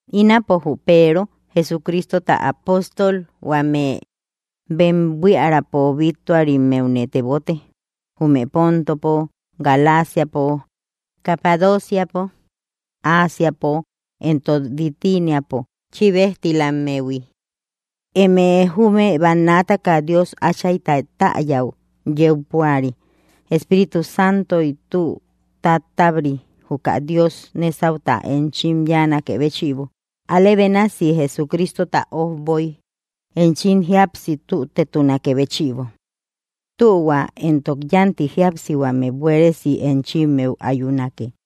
Ínapo jü Peero Jesucristota apóstol huame bem buiärapo bittuarimmeune tebote, jume Pontopo, Galaciapo, Capadociapo, Ásiapo, éntok Bitiniapo chíbejtilammehui. Eme jume bannaataka Dios Áchayta täyäu yeu púari, Espíritu Santoy tü tátabri, juka Dios nésauta enchim yáanakë béchïbo, alë bénasi Jesucristota ojboy enchim jíapsi tütetunakë béchïbo. Tühua éntok yánti jíapsihuame buéresi enchimmeu ayunake.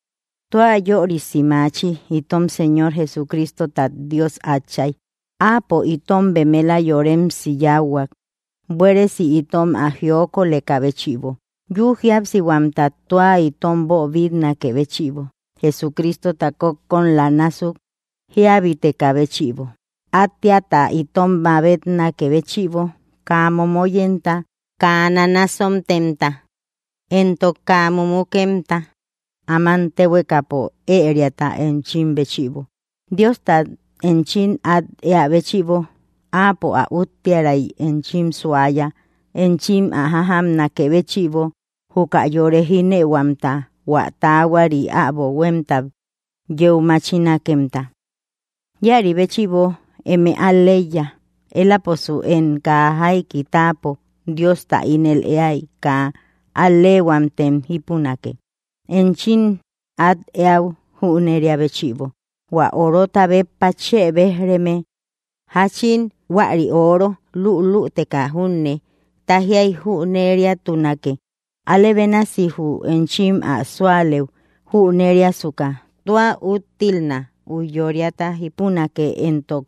Tua yörisi maachi itom Señor Jesucristota Dios Átchay, áapo itom bemela yoremsi yáuhuak, buéresi itom ä jiokolekä béchïbo, yü jíapsihuamta tua itom boobitnakë béchïbo, Jesucristota kókkolam násuk jíabitekä béchïbo, átteata itom mabetnakë béchïbo, kaa momoyemta, kaa nanasontemta, éntok kaa mumukemta áman téhuekapo ëriata enchim béchïbo, Diostat enchim át eä béchïbo, Áapo ä úttiäray enchim suaya, enchim ä jájamnakë béchïbo juka yore jínëuhuamta hua taahuari äbo huémtat yeu machinakemta. Íäri béchïbo eme al‑leiya, éläposu én kaa jaiki táapo Diosta ínel éai kaa al‑leehuamtem jípunake, enchim at eäu jüneria béchïbo, hua orota béppa chë béj‑reme. Jáchin huäri ooro luuluuteka júne tájiai jüneriatunake, alë bénasi jü enchim ä súalëu jüneriasuka tua úttilna, ujyóriata jípunake éntok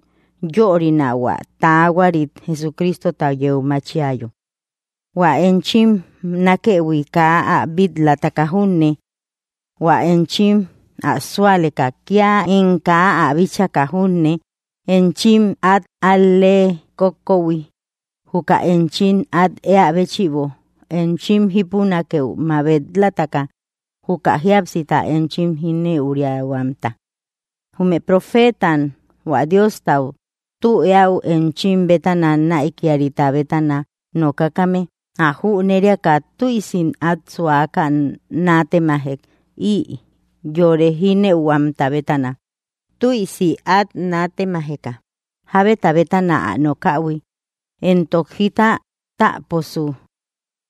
yörina hua taahuarit Jesucristota yeu machiayo. Huä enchim nákëhui kaa ä bil-lataka junne; hua enchim ä súaleka kía én kaa ä bíchaka junne, enchim át al‑lee kókköhui, juka enchim at eä béchïbo enchim jípunakëu mabet‑lataka, juka jíapsita enchim jínëuriahuamta. Jume profetam hua Diosta tü eäu enchim bétana näikiarita bétana nokakame, ä jüneriaka tüisim át suaka nátemajek ï yore jínëuhuamta bétana, tüisi át nátemajeka jábeta bétana ä nokähui, éntok jita táaposu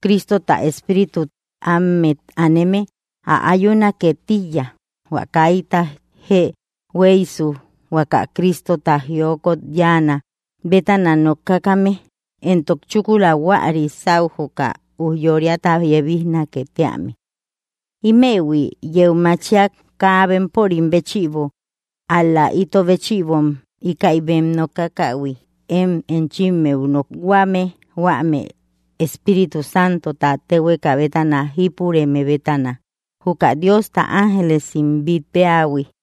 Cristota Espíritu ámet aneme ä ayunake tíiya, hua kaita jee hueisu huaka Cristota jiokot yáanä bétana nokakame, éntok chúkula huäri sáu juka ujyóriata yebijnake tíame. Ímëhui yeu machiak kaa bempörim béchïbo, ál‑la ito béchïbom íkäi bem nokakähui én enchimmeu nokhuame huame Espíritu Santota téhueka bétana jípureme bétana; juka Diosta ángelesim bít péähui.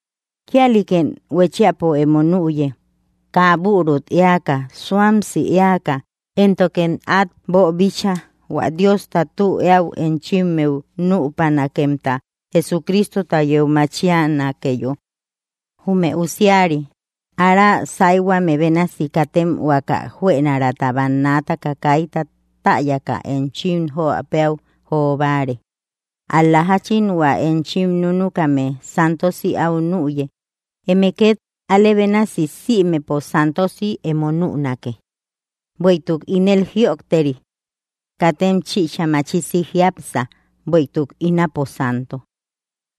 Kíalïkem huéchiapo emo nüye, kaa büruk éaka suamsi eaka, éntokem át boobíchaïhui hua Diosta tü eäu enchimmeu nüpanakemta Jesucristota yeu machianakeyo. Jume usiari ára sáyhuame bénasi katem huaka juënaraata bannaataka kaita täyaka enchim jo péäu jo báare, ál‑la jáchin hua enchim núnukame santosi áu nüye, eme két alë bénasi sïmepo santosi emo nünake; bueïtuk ínel jïojteri: “Katem chichä machisi jiápsa, bueïtuk ínapo Santo.”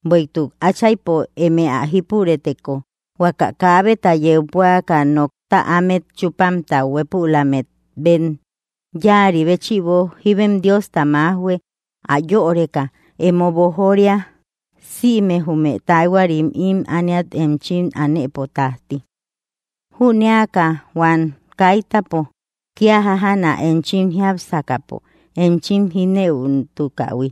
Bueïtuk Áchaypo eme ä jípurëteko, huaka kaabeta yeu púaka nokta ámet chúpamta hueepulammet bem yáari béchïbo, jíbem Diosta májhue ä yöreka emo boojoria sïme jume taahuarim ím ániat enchim anëpo tájti. Jüneaka huam kaitapo kía jájana enchim jiápsakäpo enchim jínëutukähui,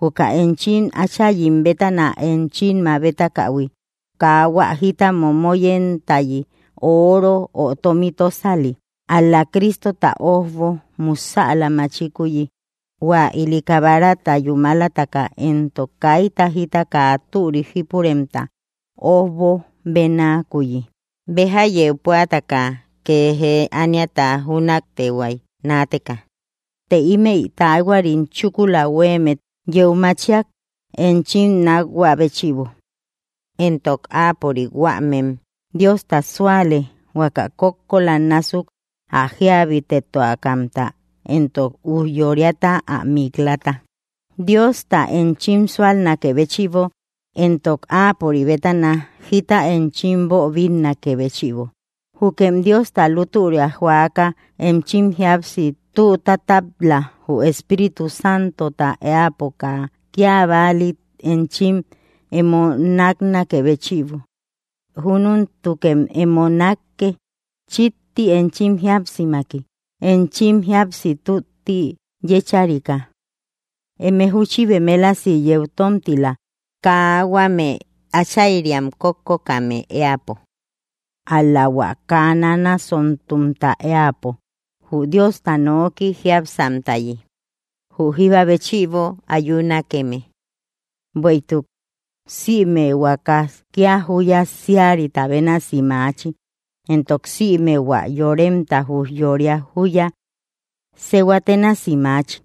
juka enchim áchayim bétana enchim mabetakähui, kaa hua jita momoyemtayi, ooro, ö tómi tósali, ál‑la Cristota ójbo musäla machikuyi, hua ili kabarata yúmalataka éntok kaita jita kaa türik jípuremta ójbo bénakuyi, béja yeu púataka kee jee ániata jünaktehuay naateka, të ímëi taahuari chúkula huéemmet yeu machiak enchim nákhuä béchïbo; éntok áapörik huämem Diosta súale, huaka kókkolam násuk ä jíabitetuakamta éntok ujyóriata ä mik‑lata, Diosta enchim súalnakë béchïbo éntok áapörik bétana jita enchim boobinnakë béchïbo. Jukem Diosta lútüria joaka enchim jíapsi tü tátab‑la, jü Espíritu Santota éäpo kaa kía bálit enchim emo náknakë béchïbo, júnentukem emo nákke chíkti enchim jíapsimaki, enchim jíapsi tútti yécharika. Eme júchi bemelasi yeu tómtila, kaa huame áchayriam kókokkame éäpo, ál‑la hua kaa nanasontumta éäpo, jü Diosta noki jiápsamtayi, jü jíba béchïbo ayunakeme. Bueïtuk: Sïme huaakas kía júya síarita bénasi maachi, éntok sïme hua yoremta ujyória júya sehua ténasi maachi.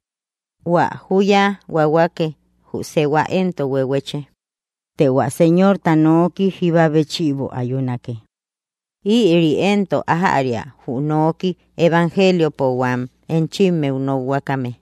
Huä júya huahuake, jü sehua éntok huehueche, të hua Señorta nooki jíba béchïbo ayunake. Ïri éntok ájäria, jü nooki evangeliopo huam enchimmeu nokhuakame.